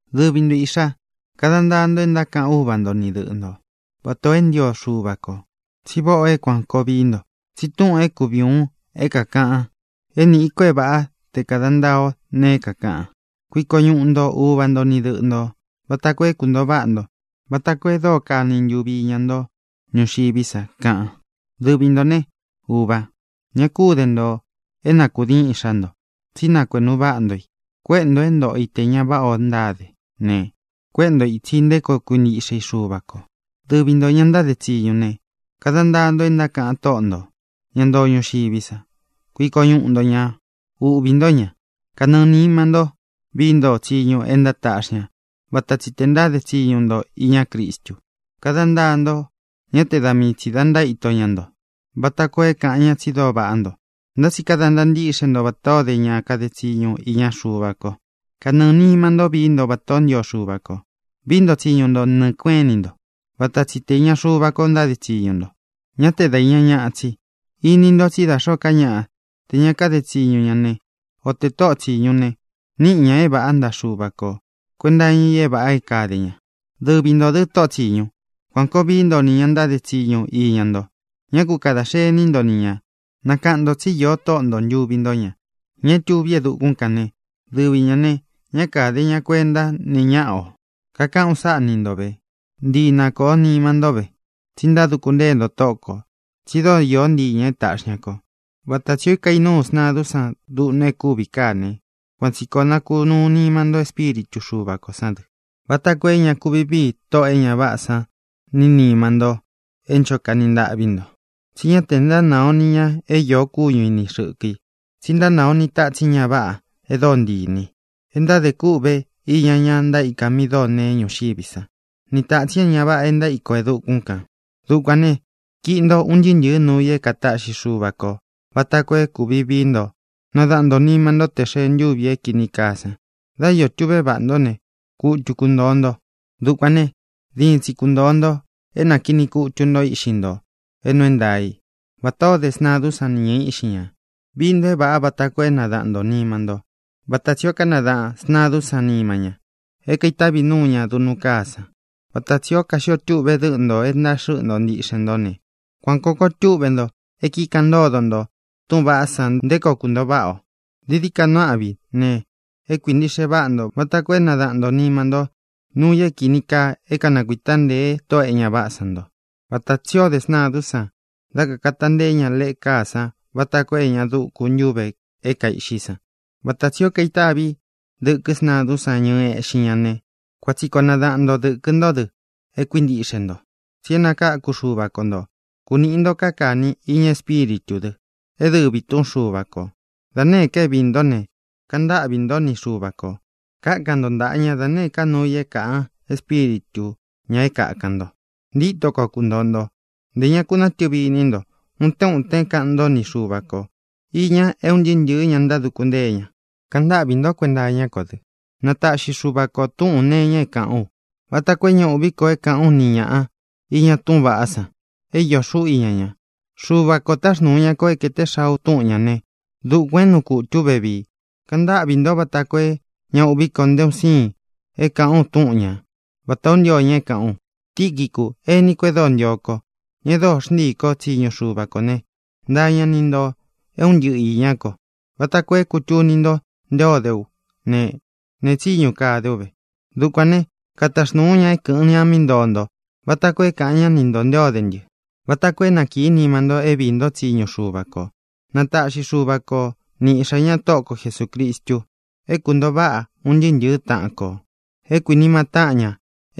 Dɨvi nto, īꞌxá, kada ntaa nto e ntákaꞌan úva nto ni dɨꞌɨ nto, vatā o é ntio Xuva kō. Tsi váꞌā o é kuān koo vií nto. Tsi túꞌūn é kuvi ūun é kākaꞌan é nīꞌi ko é vāꞌá te kāda ntaa o ne, kakaꞌan: “Kuiko ñuꞌu nto uva nto ni dɨꞌɨ ntō, vata koo é kuntōo váꞌa nto, vata koo e dóo kani ntuvi iña nto ñuxiví sa”, kaꞌan. Dɨvi ntō né, uvā, ña kú de nto é na kūdiin iꞌxá nto, tsí nakuēꞌnu váꞌa nto i. Kuéꞌe nto é ntōꞌo i te ña váꞌa o ntáde ne, kuéꞌe nto i ītsi nté koo kuntīkɨn Xúva kō. Dɨvi ntō, ña ntáde tsiñu ne, kada ntaa nto e ntákaꞌan tóꞌo ntō, ñá ntoo ñuxiví sa. Kuiko ñuꞌu nto ñā. Uꞌvī ntó ña. Kanɨɨ̄ nima ntó vií nto tsiñu e ntátaꞌxí ña vata tsi tē ntáde tsiñu nto iña Crístu. Kada ntaa nto, ñá te da mii tsī da ntaíto ntáde ña nto, vata koo é kāꞌan ñá tsi dóo vaꞌá nto, ntá tsi kada ntaa ntíꞌxe nto vatā ó de ña kade tsiñu iña Xuva ko. Kanɨɨ̄ nima ntó vií nto vatā ó ntio Xuva ko. Vií nto tsiñu nto nɨɨ̄ kueꞌén ini nto, vata tsi te īña Xuva ko ntáde tsiñu nto, ñá te da īña ñaꞌa tsi. Ini ntó tsi da xōó ka ñaꞌa, te ña kade tsiñu ne, o tē tóꞌo tsīñu ne, níꞌi ñā é vāꞌá ntaꞌa Xuva ko kuēnta iña i é vāꞌa é kāde ña. Dɨvi ntō dɨ, tóꞌo tsiñu, kuān koo vií nto nī ña ntáde tsiñu iña nto. Ñá ku kadā xení nto ni ñā. Nakaꞌan ntō tsí io Tóꞌo nto ntuvi ntó ña, ña é tuví e dukún kān né, dɨvi ñā ne, ñá kāde ña kuentá nee ñáꞌa ō. Kakaꞌán u sáꞌa ni nto vē. Ntii na kōo nima nto ve, tsi ntáduku ntée nto Tóꞌo kō. Tsi dóo īó ntii ñā é taꞌxi ña kō. Vata tsī ó kainúu sntadún san duꞌnu é kuvi káa ne, kuan tsī koo nakunúu nima nto Espíritu Xuva kō sán dɨ, vata koo é ña kuvi vii Tóꞌō e ña váꞌā san ní nima nto é ncho kani ntaꞌví nto. Tsi ñá te ntánaa o nī ña é iō kúñu i ni xɨ̄kɨ i, tsi ntánāa o ni tatsin ña váꞌā e dóo ntii inī i, e ntáde kûꞌve iña ña ntaíka mi dóo neé ñuxiví sa, ni tātsin é ña váꞌa é ntaíko e dukún kān. Dukuān ne, kiꞌi nto un ntɨɨ́ ntɨ̄ɨ́ nuu i é kātaꞌxi Xúva kō vata koo é kuvi vií nto nadaꞌan ntō nima ntó te xēe ntúvi é kīni kaa san. Dá iō tuꞌve váꞌa nto ne, kutu kuntōo nto. Dukuān ne, diin tsi kuntōo nto é nākiꞌni kutu nto íꞌxi nto é nuu é ntaā í vatā o dé sntadún san ni ñɨ̄ɨ íꞌxi ña. Vii nto é vāꞌa vata koo é nadaꞌan ntō nima ntó, vata tsī ó kanadaꞌān sntadún san nima ña é kaitavi núu ña duꞌnu káa san. Vata tsī ó kaxio túꞌve dɨꞌɨn nto e ntaxɨ́ꞌɨ nto ntíꞌxen nto ne, kuan kōo koo túꞌve nto é kikaꞌan ntódo nto túꞌūn vaꞌá san nté koo kūntóo váꞌa ō. Dií dií ka nuu áꞌvi ne, é kuintīꞌxe váꞌa nto vata koo é nadaꞌan ntō nima nto nuu i é kīni kaa é kanakuita ntēe tóꞌō e ña váꞌā san ntó, vata tsī ó de sntadún san dá kakāta nteé ña leꞌe káa san vata koo é ña dúku ña ntuvē é kaiꞌxí san. Vata tsī o kaitávi dɨ̄kɨ́ sntadún san ñɨɨ eꞌxín ña ne, kuan tsi koo nadaꞌan nto dɨ̄kɨ ntó dɨ é kuintiꞌxe ntō tsi é nakākú Xuva ko ntō. Kunīꞌi nto káa kāni iña Espíritū dɨ, é dɨvī túꞌun Xuva kō. Da nēé ka é viī ntó ne, kaꞌan ntáꞌvī ntó ni Xuva kō. Kákan nto ntaꞌa ña da nēé ka nuu i é kāꞌan Espíritu ñā é kākan nto. Ntíto koo kuntōo nto. Ntē ña ku nátɨvi iní nto. Utén utén kaꞌan ntó ni Xuva ko īña é un ntɨɨ́ ntɨ̄ɨ́ ña ntáduku ntée ña. Kaꞌan ntáꞌvī ntó kuenta iñá ko dɨ, na taꞌxi Xuva ko tūꞌún nee iña é kāꞌán u, vata koo é ña uꞌví ko é kāꞌán u ni ñāꞌa iña túꞌūn vaꞌá san é iō xuꞌú iña ña. Xuva ko taxnūu ña ko é kēte xaa u túꞌun ñā né, dukuān é nuu kutū ú vevii. Kaꞌan ntáꞌvī ntó vata koo é ña uꞌví ko nté un siin é kāꞌán u túꞌun ña, vatā ó ntio ña é kāꞌán u. Tiquicu, ení kō e dóo ntio ko, ña e dóo xntíī kó tsiñu Xuva kō né, ntaa ña ni ntō é un ntɨꞌɨ īñá ko, vata koo é kūtuni nto nté o de ú ne, nee tsíñu kade ú ve. Dukuān né, kataxnūu ú ña é kɨ̄ꞌɨn ña mí ntoo nto vata koo é kāꞌan ñá ni ntō nté o de ntɨ́, vata koo é na kīí nima nto é viī ntó tsiñu Xuva kō. Na taꞌxi Xuva ko ni Iꞌxā ñá, Tóꞌo ko Jesūcristu, é kuntōo váꞌa un ntɨɨ́ ntɨ̄ɨ́ taꞌan kō, é kuīnima táꞌan ña,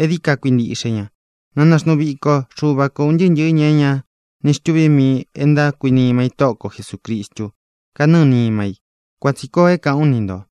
é dií ka kuintiꞌxe ña. Na naxnuu viko Xuva ko ūn ntɨɨ́ ntɨ̄ɨ́ ña é ña ni xtuví mii i e ntákuinima i Tóꞌo ko Jesūcristu kánɨɨ nima i. Kuan tsī koo é kāꞌán u ni ntō.